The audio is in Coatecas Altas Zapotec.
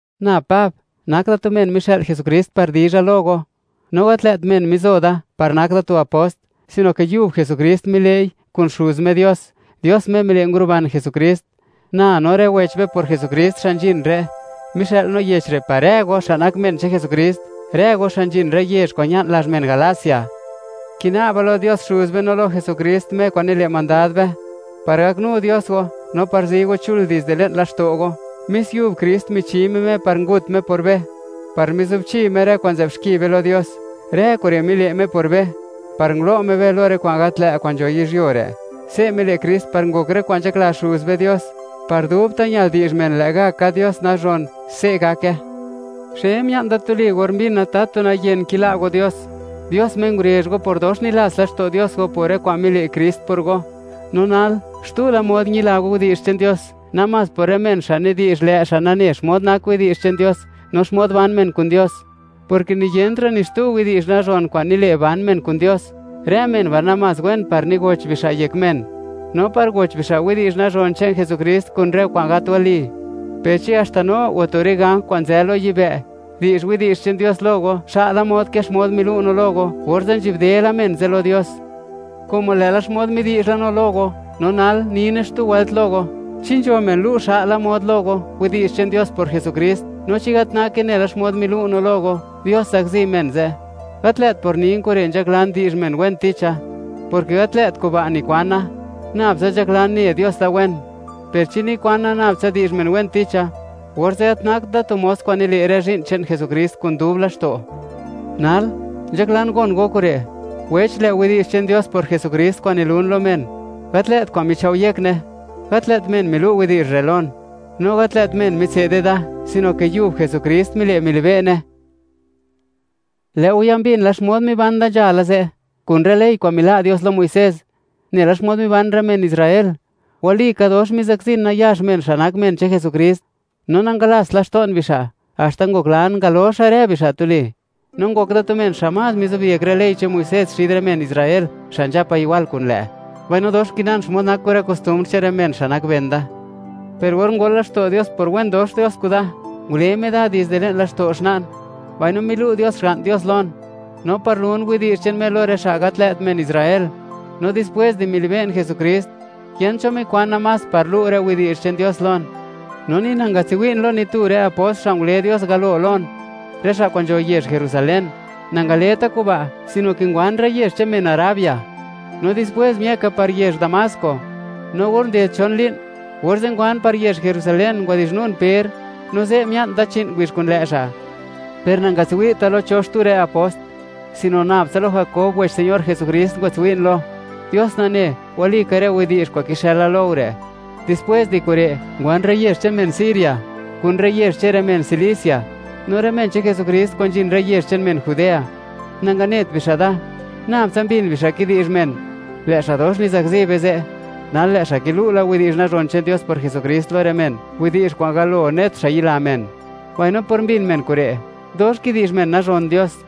Na Pab, nak da tu men mixë'l Jesukrist par dizha lo go, no gat lë't men mizo da, par nak da tu apost, sino ke yub Jesukrist mile'i, kun Xuz Me Dios, Dios Me mile' nguruban Jesukrist. Na, no rë wech be por Jesukrist xa' nzhin re', mixë'l no yech re' par rë go, xa' nak men che'n Jesukrist, rë go xa' nzhin rë yezh kwa'n ña'n lazh men Galacia. Kina'ba lo Dios Xuz be no lo Jesukrist, Me kwa'n nile' mandad be, par gaknu Dios go, no par zi go chul dizde le'n laxto' go. Mis yub Krist michi Me Me par ngut Me por be, par mizubchi Me rë kwa'n nzë'b xki be lo Dios. Rë kure' mile' Me por be, par ngulo' Me be lo rë kwa'n gat lë' kwa'n nzho yizhyuo re'. Se' mile' Krist, par ngok rë kwa'n nzhakla Xuz be Dios. Par dubta' ñal di'zh men, lë' ga' ka Dios nazhon. Se' gake. ¡Xe mia'n da tuli!, or mbina tatu nayen kila' go Dios, Dios Me ngurezh go por dox nilats laxto' Dios go por rë kwa'n mile' Krist por go. No nal, xtu la mod ñila go widi'zh che'n Dios, namás por rë men xa' nidi'zh, lë' xa' nane xmod nak widi'zh che'n Dios, no xmod ban men kun Dios, porke niyentra' ni xtu widi'zh nazhon kwa'n nile', ban men kun Dios. Rë men ba' namás wen par nigoch bixa' yek men, no par goch bixa' widi'zh nazhon che'n Jesukrist kun rë kwa'n gat wali. Per chi haxta no o tu rë ganj kwa'n nzë lo yibë', di'zh widi'zh che'n Dios lo go, xa'la mod ke xmod milu' no lo go; orze', ¡nzhi'bde la men ze' lo Dios! Como lë'la xmod midi'zh la no lo go, no nal nine xtu wëlt lo go: Chi nzho men lu' xa'la mod lo go, widi'zh che'n Dios por Jesukrist, no chi gat nake nela xmod milu' no lo go, ¡Dios zakzi men ze'! ¡Gat lë't por nin kure' nzhaklan di'zh men wen ticha, porke gat lë't kuba' nikwana! Nabtsa nzhaklan, ne Dios da wen. Per chi nikwana, nab tsa di'zh men wen ticha, orze' gat nakt da tu mos kwa'n nile' rë zhi'n che'n Jesukrist kun dub laxto'. Nal, nzhaklan gon go kure', wech; lë' widi'zh che'n Dios por Jesukrist kwa'n nilun lo men, gat lë't kwa'n michao' yekne. Gat lë't men milu' widi'zh re' lon, no gat lë't men mitse'de da, sino ke yub Jesukrist mile' milibe'ne. Lë' go ya mbin la, xmod miban da nzhala ze', kun rë ley kwa'n mila' Dios lo Muisés, nela xmod niban rë men Israel. Walika dox mizakzin nayax men, xa' nak men che'n Jesukrist, no nangalast laxto'n bixa', haxta ngoklan ngaloxa rë bixa' tuli. No ngok da tu men xa' más mixo'byek rë ley che'n Muisés xid rë men Israel, xa' nzhapa igwal kun lë', mbaino dox nkinan xmod nak kun rë kostumbr che'n rë men xa' nak ben da. Per or ngol laxto' Dios por wen dox Dios kuda, ngule Me da dizde le'n laxto' xna'n, mbaino milu' Dios Xga'n Dios lon, no par lun widi'zh che'n Me lo rë xa' gat lë't men Israel. No dispwés di milibe'n Jesukrist, yent cho mikwana más par lu' rë widi'zh che'n Dios lon, no ni nangatswi'n lo ni tu rë apost, xa' ngule Dios galo lon, rë xa' kwa'n nzho yezh Jerusalén. Nangaleta kuba', sino ke ngwan rë yezh che'n men Arabia, no dispwés miëka par yezh Damasco. No or nded chon li'n, orze' ngwan par yezh Jerusalén, ngwadi'zhnun Per, no ze' mia'n da chi'n ngubizh kun lë' xa'. Per nangatswi'ta lo cho xtu rë apost, sino nab tsa lo Jakob wech Señor Jesukrist ngwatswi'n lo. ¡Dios nane, walika rë widi'zh kwa'n kixëla lo go re'! Dispwés di kure', ngwan rë yezh che'n men Siria, kun rë yezh che'n rë men Cilicia. No rë men che'n Jesukrist kwa'n nzhin rë yezh che'n men Judea, nanganet bixa' da. Nabtsa mbin bixa' kidi'zh men: “Lë' xa' dox mizakzi be ze', ¡nal lë' xa' kilu' la widi'zh nazhon che'n Dios por Jesukrist lo rë men, widi'zh kwa'n galo net xa' yila men!” Mbaino por mbin men kure', dox kidi'zh men nazhon Dios.